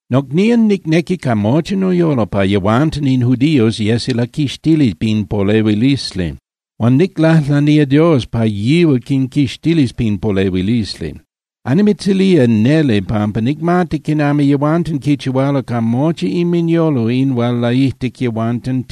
Nocnían, nicnequi ca mochi noyolo pa yehuanten in judíos yesi laquixtili pin polehuilisli. Huan niclajlanía Dios pa yihual quinquixtilis pin polehuilisli. Annimitzilía neli pampa nicmati quinami yehuanten quichihualo ca mochi inminyolo in hual laijtic yehuanten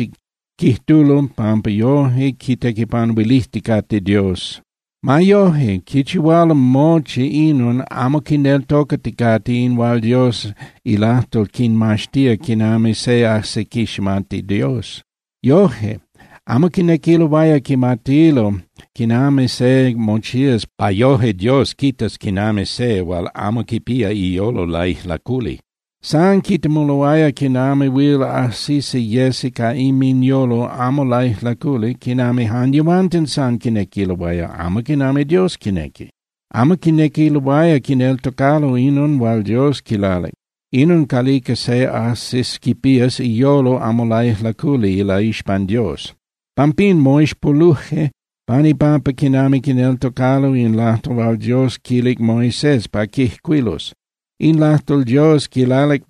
quijtulo pampa yoje quitequipanuilijticate Dios. Ma yoje, quichihualo mochi inon amo quineltocaticate in hual Dios ilajtol quinmaxtía quinami se ajsi quiximati Dios. Yoje, amo quinequiloaya quimatilo quinami se mochías pa yoje Dios quitas quinami se hual amo quipía iyolo laijlaculi. San quitemuloaya quinami huil ajsisi yesi ca inminyolo amo laijlaculi quinami jan yehuanten san quinequiloaya, amo quinami Dios quinequi. Amo quinequiloaya quineltocalo inon hual Dios quilalic, inon calica se ajsis quipías iyolo amo laijlaculi ilaixpan Dios. Pampín, moixpoluje pan ipampa quinami quineltocalo in lajtol hual Dios quilic Moisés pa quijcuilus. In lajtol Dios quilalic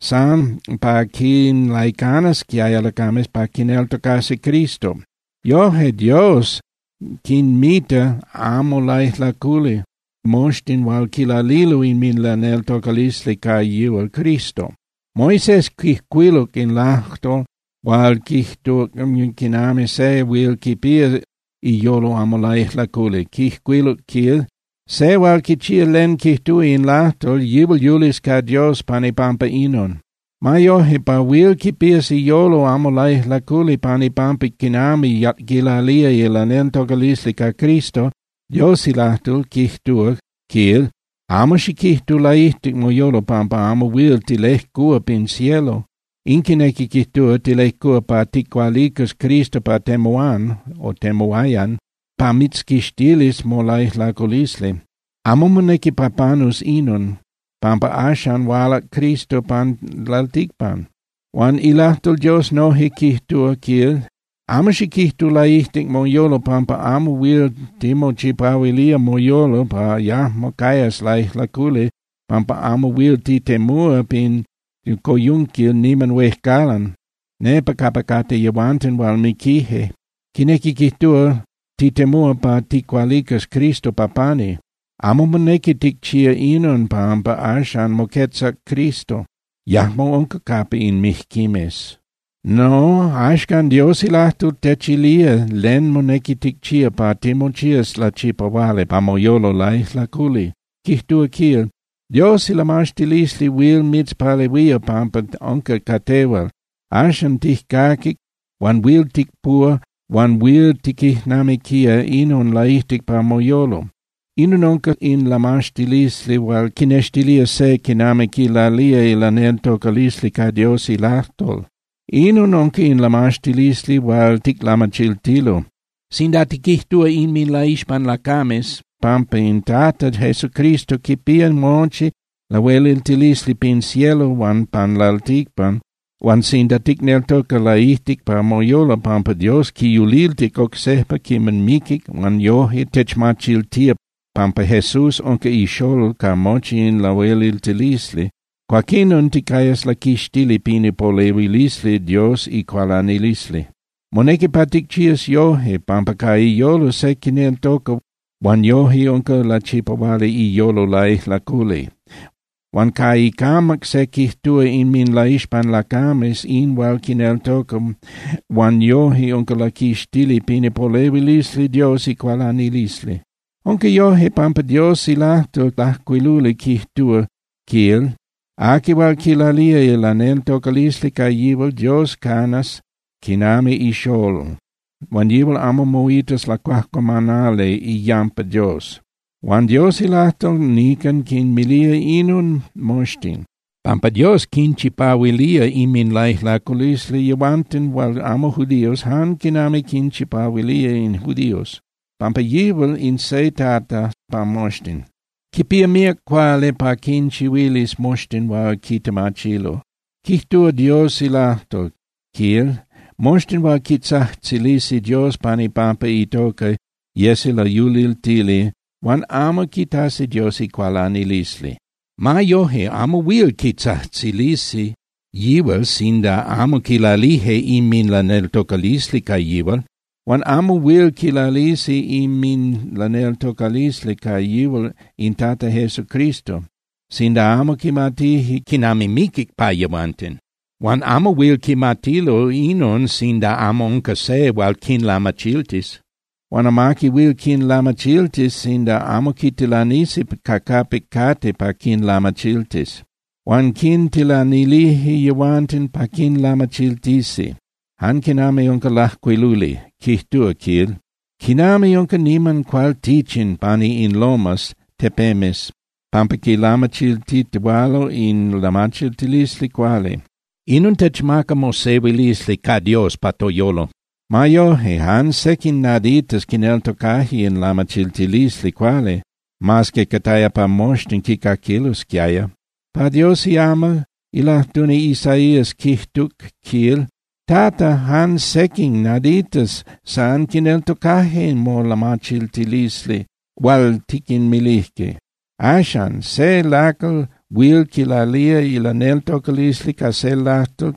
san pa quinlaicanasquiaya lacames pa quineltocasi Cristo. Yoje Dios quinmita amo laijlaculi moxtin hual quilalilo inminlaneltocalisli ca yihual Cristo. Moisés quijcuiluc in lajtol hual quijtuc quinami se huil quipía iyolo amo laijlaculi, quijcuiluc, quil: “Se hual quichía len quijtúa in lajtol, yihual yulis ca Dios pan ipampa inon.” Ma yoje, pa huil quipías iyolo amo laijlaculi pan ipampa quinami quilalía ilaneltocalisli ca Cristo, Dios ilajtol quijtúa, quil: “Amo xiquijtu laijtic moyolo pampa amo huil tilejcúa pin cielo.” In quinequi quijtúa, tilejcúa pa ticualicas Cristo pa temuán (temuayan) pa mitzquixtilis molaijlaculisli. Amo monequi pa panus inon, pampa axan hualac Cristo pan lalticpan. Huan ilajtol Dios noje quijtúa, quil: “Amo xiquijtu laijtic moyolo pampa amo huil timochipahuilía moyolo pa yajmo cayas laijlaculi pampa amo huil titemúa pin coyunquil niman huejcalan, nepa capa cate yehuanten hual miquije.” Quinequi quijtúa, titemúa pa ticualicas Cristo pa pani. Amo monequi ticchía inon pampa axan moquetzac Cristo, yajmo unca capa in mijquimes. No, axcan Dios ilajtol techilía len monequi ticchía pa timochías lachipahuali pa moyolo laijlaculi, quijtúa, quil: “Dios ilamaxtilisli huil mitzpalehuía pampa unca ca tehual. Axan tijcaquic huan huil ticpuhua huan huil tiquijnamiquía inon laijtic pa moyolo.” Inon unca in lamaxtilisli hual quinextilía se quinami quilalía ilaneltocalisli ca Dios ilajtol. Inon unca in lamaxtilisli hual ticlamachiltilo: Sinda tiquijtúa inminlaixpan lacames pampa in Tata Jesúcristo quipía mochi lahueliltilisli pin cielo huan pan lalticpan, huan sinda ticneltoca laijtic pa moyolo pampa Dios quiyuliltic oc sejpa quiman miquic huan yoje techmachiltía pampa Jesús unca iXolol ca mochi in lahueliltilisli, cuaquinon ticayas laquixtili pin ipolehuilisli Dios icualanilisli. Monequi pa ticchías yoje, pampa ca iyolo se quineltoca huan yoje unca lachipahuali iyolo laijlaculi. Huan ca icamac se quijtúa inminlaixpan lacames in hual quineltoca huan yoje unca laquixtili pin ipolehuilisli Dios icualanilisli. Unca yoje, pampa Dios ilajtol lajcuiluli quijtúa, quil: “Aqui hual quilalía ilaneltocalisli ca yihual, Dios canas quinami ixolol huan yihual amo moitas lacuajcuamanali iyampa Dios.” Huan Dios ilajtol nican quinmilía inon moxtin, pampa Dios quinchipahuilía inminlaijlaculisli yehuanten hual amo judíos jan quinami quinchipahuilía in judíos, pampa yihual in se Tata pa moxtin. Quipía míac cuali pa quinchihuilis moxtin hual quitemachilo. Quijtúa Dios ilajtol, quil: “Moxtin hual quitzajtzilisi Dios pan ipampa itoca yesi layuliltili huan amo quitasi Dios icualanilisli.” Ma yoje, amo huil quitzajtzilisi yihual sinda amo quilalije inminlaneltocalisli ca yihual. Huan amo huil quilalisi inminlaneltocalisli ca yihual in Tata Jesucristo sinda amo quimatije quinami miquic pa yehuanten. Huan amo huil quimatilo inon sinda amo unca se hual quinlamachiltis. Huan amaqui huil quinlamachiltis sinda amo quitilanisi ca capic cate pa quinlamachiltis. Huan quintilanilije yehuanten pa quinlamachiltisi, jan quinami unca lajcuiluli. Quijtúa, quil: “¡Quinami unca niman cualtichin pani in lomas (tepemes) pampa quilamachiltitihualalo in lamachiltilisli cuali! Inon techmaca mosehuilisli ca Dios pa toyolo.” Ma yoje, jan sequin naditas quineltocaje in lamachiltilisli cuali, mas que cataya pa moxtin quicaquilosquiaya. Pa Dios iamal, ilajtuni Isaías quijtuc, quil: “Tata, jan sequin naditas san quineltocajque molamachiltilisli hual tiquinmilijque.” Axan, se lacal huil quilalía ilaneltocalisli ca se lajtol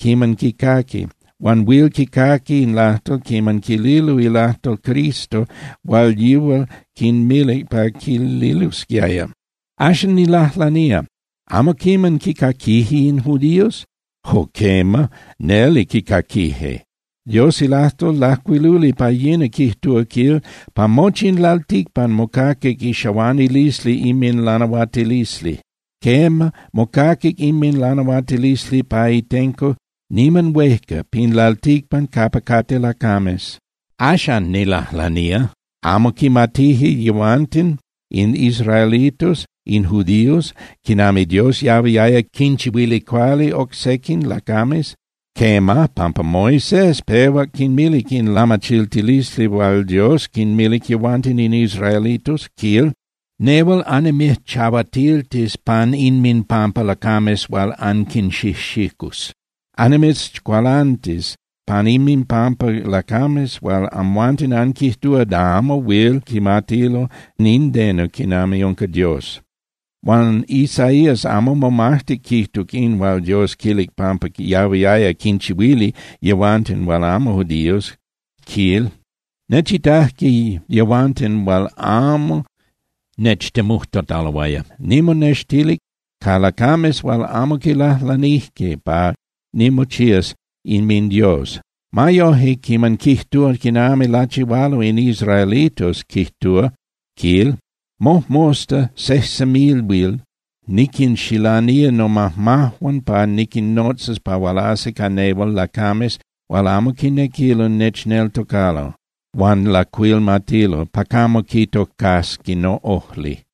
quiman quicaqui, huan huil quicaqui in lajtol quiman quililo ilajtol Cristo hual yihual quinmilic pa quililosquiaya. Axan, nilajlanía, ¿amo quiman quicaquije in judíos? ¡Jo quema, neli quicaquije! Dios ilajtol lajcuiluli pa yina quijtúa, quil: Pa mochi in lalticpan mocaquic ixahuanilisli inminlanahuatilisli. Quema, mocaquic inminlanahuatilisli pa itenco niman huejca pin lalticpan capa cate lacames. Axan, nilajlanía, ¿amo quimatije yehuanten in israelitos, in judíos, quinami Dios yahuiaya quichihuili cuali oc sequin lacames? Quema, pampa Moisés pehuac quinmilic in lamachiltilisli hual Dios quinmilic yehuanten in israelitos, quil: Nehual annimijchahuatiltis pan inminpampa lacames hual anquinxijxicus. Annimitzcualantis pan inminpampa lacames hual amhuanten anquijtúa da amo huil quimatilo nindeno quinami unca Dios. Huan Isaías amo momajtic quijtuc in hual Dios quilic pampa yahuiaya quinchihuili yehuanten hual amo judíos, quil: Nechitajque yehuanten hual amo nechtemujtataloaya. Nimonextilic ca lacames hual amo quilajlanijque pa nimochías inminDios. Ma yoje, quiman quijtúa quinami lachihualo in israelitos, quijtúa, quil: Mojmosta, sejsemilhuil niquinxilanía nomajmajuan pa niquinnotzas pa hualasi ca nehual lacames hual amo quinequilo nechneltocalo huan lacuilmatilo pa camo quitocasqui noꞌojli.